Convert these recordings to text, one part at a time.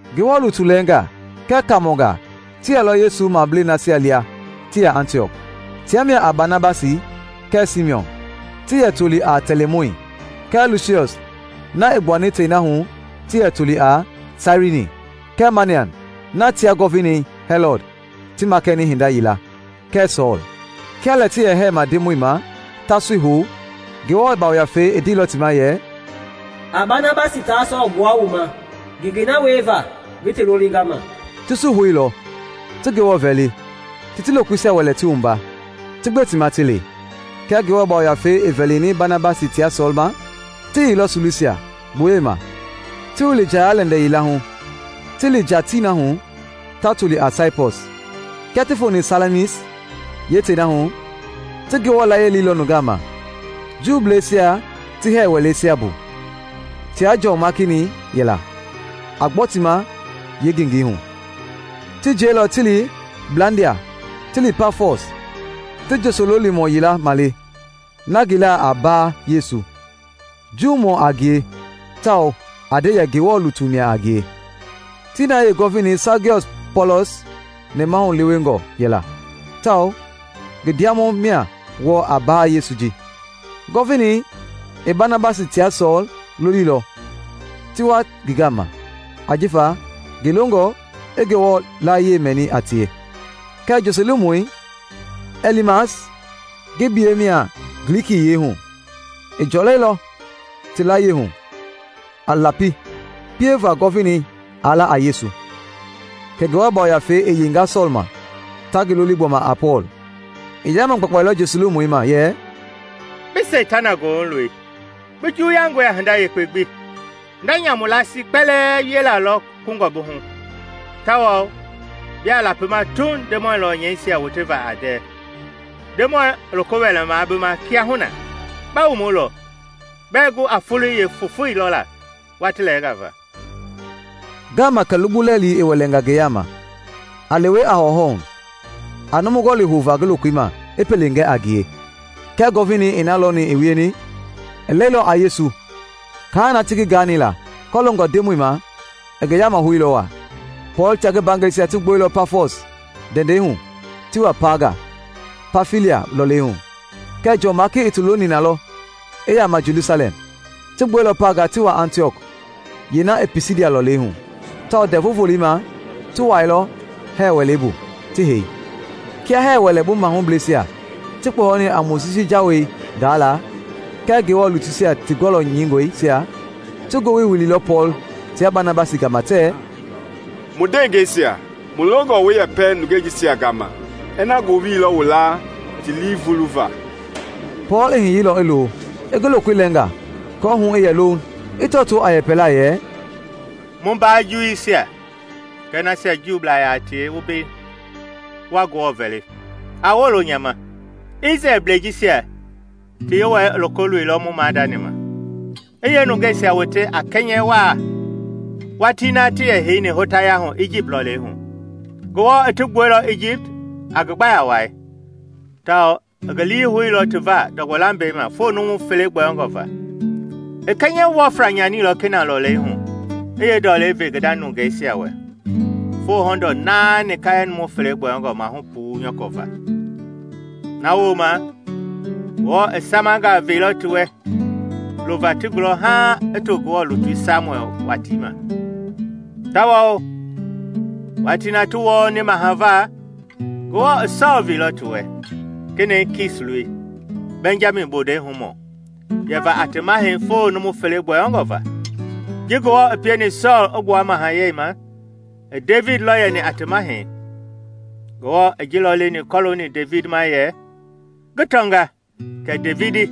Ngewɔ lutu lɛɛngaa kɛɛ kaamɔngaa ti yɛlɔ Yesu mablei nasia lia ti yɛ Antiɔk. Tia mia a Banabasi kɛɛ Simiɔn (ti yɛ toli a Tɛlimɔi) kɛɛ Lusiɔs (na i gbuani tei na hu ti yɛ toli a Sairini) kɛɛ Manaɛn (na tia Gɔvinei Hɛlɔd ti makɛni hinda yila) kɛɛ Sɔɔl. Kia lɛ ti yɛ hɛɛma Ndemɔi ma, ta sui hou, Ngewɔ Yafei i ndeilɔ ti ma yɛ, “A Banabasi taa Sɔɔl gbua wu ma ngengei na wieva ngi ti lolinga ma.” Ti sui houilɔ, ti Ngewɔ vɛli, ti ti lokoisia wɛlɛ ti wumba, ti gbe ti ma ti li. Kia Ngewɔ Yafei i vɛlini Banabasi tia Sɔɔl ma, ti yeilɔ Silusia, gboyei ma, ti wili njaya-lɛndɛ yila hu ti li tii na hu ta toli a Saipɔs. Kia ti foni Salamis, yeetii na hu, ti Ngewɔ yiɛi leilɔ nungaa ma Juuisia ti hɛɛ wɛleisia bu. Tia Jɔn Maaki-ni yɛla, a gbɔ ti ma yeengengei hu. Ti jiɛilɔ ti tii blandia ti li Pafɔs, ti njosololimɔ yila male na ngi laa a Baa Yesu, Juumɔ a ngie tawao a nde yɛ Ngewɔ lutu mia a ngie. Tii na yeegɔvinei Sagiɔs Pɔɔlɔs nɛmahu lewengɔ yɛla tawao ngi ndiamɔi mia wɔɔ a Baa Yesu ji. Gɔvinei i Banabasi tia Sɔɔl loliilɔ ti wa ngi gama ajifa ngi longɔ i Ngewɔ yiɛi mɛni a tie. Kɛɛ njosoloolimɔi, Ɛlimas (ngi biyɛi mia Glikiyiɛi hu), i jɔlɛilɔ ti layie hu a lapi pieva Gɔvinei aa la a Yesu. Kɛ Ngewɔ Yafei i yeinga Sɔɔl ma -- ta ngi loli gbɔma a Pɔɔl; i yaama gbakpailɔ njosololimɔi ma yɛ “Bi Seitana goohu loi! Bi juwuyangɔe a hinda yekpe gbi; hinda nyamu laasii kpɛlɛɛ wiela lɔ kungɔ bi hu, tawao biaa lapima Tuuŋ Ndemɔi lɔnyɛisia woteva a ndɛɛ! Ndemɔi i loko wɛlɛma bi ma kiahuna; ba wumulɔ, bɛɛ gu a foloi yeefofoi lɔla watii lɛɛnga va.” Ngaama kɛ lugbu lɛilɛi i wɛlɛnga ngi yaama, a lewe a hɔwɔhɔwɔ hu, a numu gɔli houva ngi lokoi ma i pele gɛ a ngie. Kia Gɔvinei i na lɔni i wieni, i lɛilɔ a Yesu, kaa na ti ngi gaani la kɔloongɔ Ndemɔi ma i ngi yama houilɔ waa. Pɔɔl tia ngi mbaangɛisia ti gbuɛilɔ Pafɔs ndɛndɛi hu ti wa Paaga, Pamfilia lɔlei hu; kɛɛ Jɔn Maaki i ti loni na lɔ i yaama Jelusalɛm. Ti gbuɛilɔ Paaga ti wa Antiɔk yeena i Pisidia lɔlei hu, tawao Ndɛvu Volei ma ti wuailɔ hɛɛ wɛlei bu ti hei. Kia hɛɛ wɛlei bu mahubleisia ti kpɔyɔni a Mojisi Jawei gaala kɛɛ Ngewɔ lutuisia ti gɔlɔ nyɛingɔisia, ti ngowili wililɔ Pɔɔl tia Banabasi gama tɛɛ, “Mu ndewengeisia, mu longɔ wu yɛpɛ nungeisia gama ina ngowili lɔ wu laa ti lii vuluva.” Pɔɔl i hiyeilɔ i lo, i ngi lokoi lɛnga aako hu i yɛ louŋ, i tɔtoo a yɛpɛlaa yɛ, “Mu mbaa Juuisia kɛɛ nasia Juublaa yaa tie wu mbei wa Ngewɔ vɛli, a wolo nya ma. Isrɛlbleisia jisia ti Yewɔɛi i loko loilɔ mu maadani ma, i yeenungeisia wote a kɛnyɛ waa watii na ti yɛ heini hotaya hu Ijipt lɔlei hu. Ngewɔ i ti gbuɛilɔ Ijipt a ngi gbaya wai, tawao i ngi lii houilɔ ti va ndɔgbɔ lambɛi ma foo numu fele gbɔyɔngɔ va. I kɛnyɛ wɔfla nyanilɔ Kenaan lɔlei hu i yeendɔlei ve ngi nda nungeisia wɛ foo hɔndɔɔ naani kaalɛ numu fele gbɔyɔngɔ maahu puu nyɔkɔ va. “Na wooma Ngewɔ i samanga veilɔ ti wɛ lova ti gulɔ haaŋ i to Ngewɔ lutui Samuɛl watii ma. Tawao watii na ti wɔɔni maha va, Ngewɔ i Sɔɔl veilɔ ti wɛ, kenɛi Kis loi, Bɛnjami bondei humɔ, yɛva a ti mahɛi foo numu fele gbɔyɔngɔ va. Ji Ngewɔ i pieni Sɔɔl i gbua mahayɛi ma, i Devidi lɔ yɛni a ti mahɛi. Ngewɔ i ji lɔ leni kɔlooni Devidi ma yɛ, ‘Ngi tɔnga kɛ Devidi,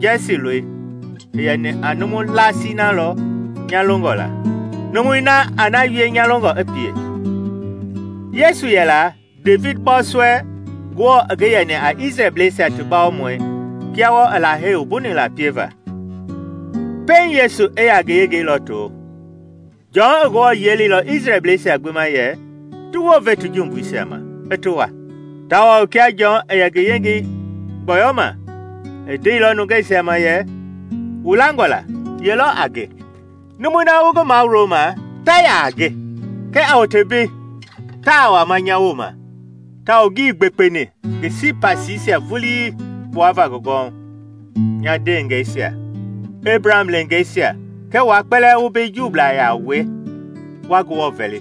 Jɛsi loi, i yɛni a numu laasii na lɔ nya longɔ la, numui na a na wie nya longɔ i pie.’ Yesu yɛla, Devidi bɔɔsɔɛi, Ngewɔ i ngi yɛni a Isrɛlbleisia ti bawomɔi kia wɔɔ i Lahei wumbuni la pieva. Pɛiŋ Yesu i yaa ngi yengei lɔto, Jɔn i Ngewɔ yiɛi leilɔ Isrɛlbleisia gbi ma yɛ ti wounve ti jumbuisia ma, i ti wua. Tawao kia Jɔn i yɛ ngi yengei gbɔyɔma, i ndeilɔ nungeisia ma yɛ, ‘Wu langɔ la ye lɔ a nge? Numui na wu ngi mawuloma ta yaa a nge. Kɛɛ a wote mbei! Taa wama nya wooma tawao ngii gbekpeni ngi sipasiisia vulii gbuava ngi gɔwɔhu.’ “Nya ndeengɛisia, Ebraham leengeisia kɛɛ wua kpɛlɛɛ wu mbei Juublaa yaa wue wa Ngewɔ vɛli: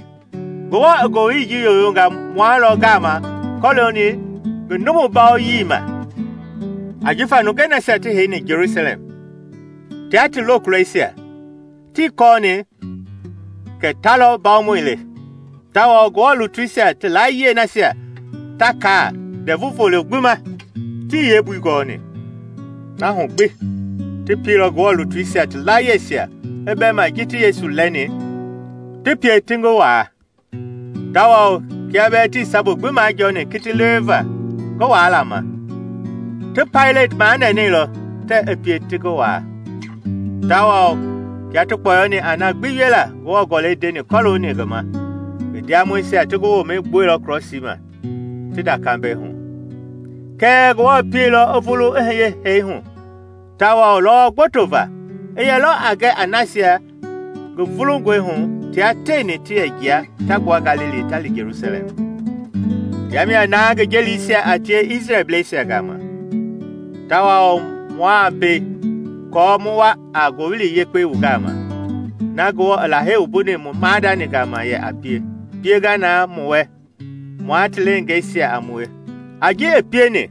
Ngewɔ i ngowili ji yoyonga mua lɔ gama kɔlooni ngi numu bawoyii ma! Ajifa nungei nasia ti heini Jelusalɛm tia ti lokulɔisia tii kɔɔni kɛ ta lɔ mbawomɔi le, tawao Ngewɔ lutuisia ti layie nasia ta kaa Ndɛvu Volo gbi ma, tii yeembui gɔɔni. Na hu gbi ti pielɔ Ngewɔ lutuisia ti laayiɛisia i bɛma ji ti Yesu lɛɛni, ti pie ti ngi waa. Tawao kia bɛɛ tii sabu gbi majɔɔni kiti leweva ngi waala ma ti Paileti manɛnɛilɔ tɛɛ i pie ti ngi waa. Tawao kia ti kpɔyɔni a na gbi wiela Ngewɔ Gɔlɛi ndeni kɔlooni ngi ma, ngi ndiamɔisia ti ngi womɛi gbuɛilɔ krɔsii ma ti nda kambɛi hu. Kɛɛ Ngewɔ pieilɔ i vulu i hiye hee hu, tawao lɔwɔ gboto va i yɛlɔ a gɛ a nasia ngi vulungɔihu tia tieni ti yɛ jia ta gbua Galili ta li Jelusalɛm. Tia mia na ngi jelisia a tie Isrɛlbleisia gama. Tawao mua mbei aako mu wa a Ngowili Yekpei wu gama: na Ngewɔ i Lahei wumbuni mu maadani gama yɛ a pie, i pienga na mu wɛ, mua ti leengeisia a mue, a ji i pieni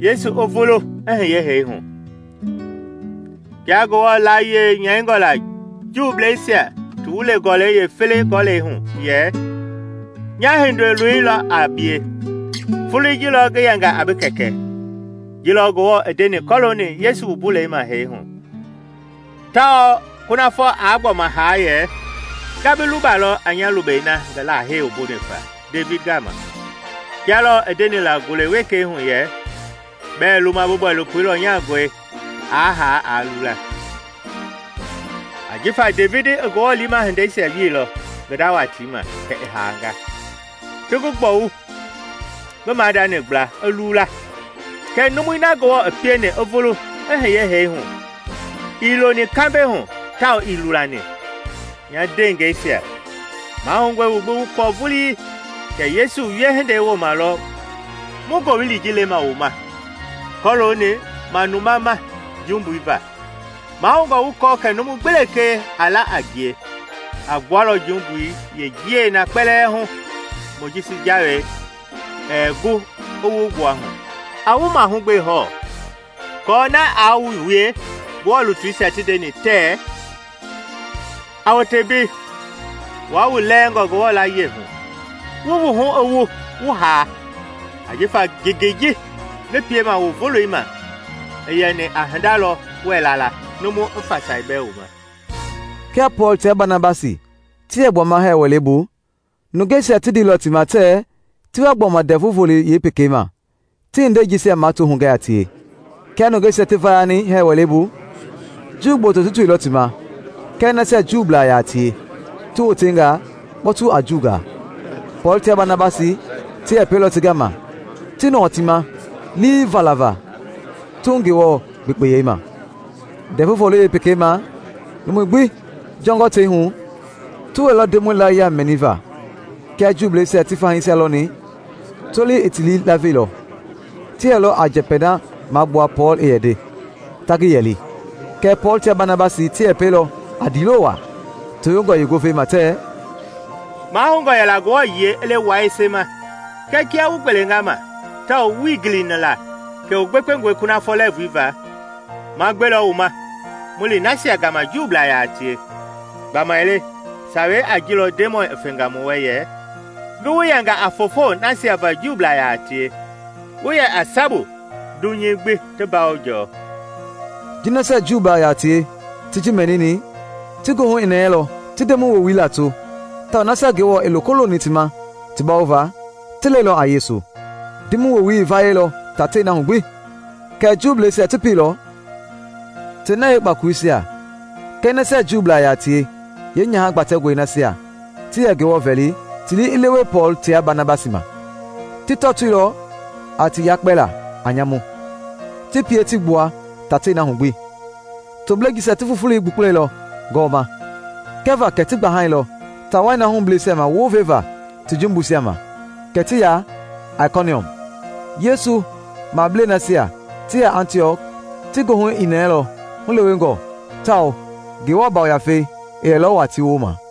Yesu i vulu i hiye hee hu. Kia Ngewɔ layie nyɛingɔ la Juuisia ti Wulei yeefele Gɔlɛi hu yɛ, ‘Nya Hindoloi lɔ a bie; foloi ji lɔ ngi yɛnga a bi Kɛkɛ.’ Ji lɔ Ngewɔ i ndeni kɔlooni Yesu wumbulei ma hee hu tawao kunafɔ aa gbɔma haa yɛ, ‘Nga bi lubalɔ a nya lubɛi na ngi Lahei wumbuni faa Devidi gama.’ Kia lɔɔ i ndeni la ngule wekei hu yɛ, ‘Bɛɛ luma bi bɔilopo lɔnyangɔi aa haa aa lula.’ Ajifa Devidi i Ngewɔ liima hindeisia wielɔ ngi nda watii ma; kɛ i haanga, ti ngi gbɔwu ngi maadani gbla, i lula. Kɛɛ numui na Ngewɔ i pieni i vulu i hiye hee hu ii loni kambɛi hu tawao ii lulani. Nya ndeengɛisia, mahoungɔe wu gbi wu kɔɔ vulii kɛ Yesu wiehindei wooma lɔ mu Ngowili ji lema wu ma kɔlooni manuma ma jumbui va; maahoungɔ wu kɔɔ kɛ numu gbi lekee a la a ngie a gbualɔ jumbui yeenjiɛi na kpɛlɛɛ hu Mojisi Jawei ɛɛ gu i wu gbua hu. A wu mahugbe hɔɔ aako na aa wu wie Ngewɔ lutuisia ti ndeni tɛɛ, ‘A wote mbei, wua wu lɛɛngɔ Ngewɔ layie hu! wu wuhu i wu, wu haa! Ajifa ngengei ji ngi piema wu voloima i yɛni a hinda lɔ wɛɛ la la, numu i fasai bɛɛ wu ma!’” Kia Pɔɔl tia Banabasi ti yɛ gbuama hɛɛ wɛlei bu, nungeisia ti ndeilɔ ti ma tɛɛ ti wa gbɔma Ndɛvu Volei yeepekei ma ti hindei jisia mato hugɛ a tie. Kia nungeisia ti vayani hɛɛ wɛlei bu, Juu gboto ti toilɔ ti ma kɛɛ nasia Juublaa yaa tie ti wotenga kpɔtu a Juungaa. Pɔɔl tia Banabasi ti yɛpɛilɔ ti gama ti nɔɔ ti ma lii falava Tuuŋ Ngewɔ gbekpeyei ma. Ndɛvu Volei yeepekei ma numui gbi jɔngɔ tei hu ti wɛilɔ Ndemɔi yiɛi mɛniva. Kia Juuisia ti fahiisia lɔni, tolei i ti lii laveilɔ; ti yɛlɔ a njɛpɛi na magbua Pɔɔl i yɛ nde, ta ngi yɛli. Kɛɛ Pɔɔl tia Banabasi ti yɛpɛilɔ a ndiilo waa tewengɔ yeengovei ma tɛɛ, “Mahoungɔ yɛla Ngewɔ yiɛi i le wua yese ma. Kɛɛ kia wu gbelenga ma tawao wuii gilini la kɛ wu gbekpengɔe kunafɔ lɛɛvui va, ma gbelɔ wu ma mu li nasia gama Juublaa yaa tie. Gbamaile sawei a ji lɔ Ndemɔi i fenga mu wɛ yɛ, ‘Ngi wu yɛnga a foofo nasia va Juublaa yaa tie, wu yɛ a sabu dunyei gbi ti mbawo jɔɔ.’” Ji nasia Juublaa yaa tie ti ji mɛnini, ti goohu i nɛɛlɔ, ti Ndemɔi woowili lato; tawao nasia Ngewɔ i loko loni ti ma ti bawova ti lɛilɔ a Yesu. Ndemɔi woowili i vayɛilɔ tatei na hu gbi. Kɛɛ Juuisia ti pieilɔ tei na yeekpakoloisia kɛɛ nasia Juublaa yaa tie yeenyaha gbatɛngɔi nasia ti yɛ Ngewɔ vɛli ti lii i lewe Pɔɔl tia Banabasi ma. Ti tɔtoilɔ a ti yakpɛla a nyamu, ti pie ti gbua tatei na hu gbi. Toblei jisia ti fufulei gbukpulɛilɔ gɔwɔma kɛva kɛ ti gbahailɔ taa wai na hubleisia ma wounvevaa ti jumbuisia ma, kɛ ti ya Aikoniɔm. Yesu mablei nasia ti yɛ Antiɔk ti goohu i nɛɛlɔ hulewengɔ tawao Ngewɔ Yafei i yɛlɔ waa ti wooma.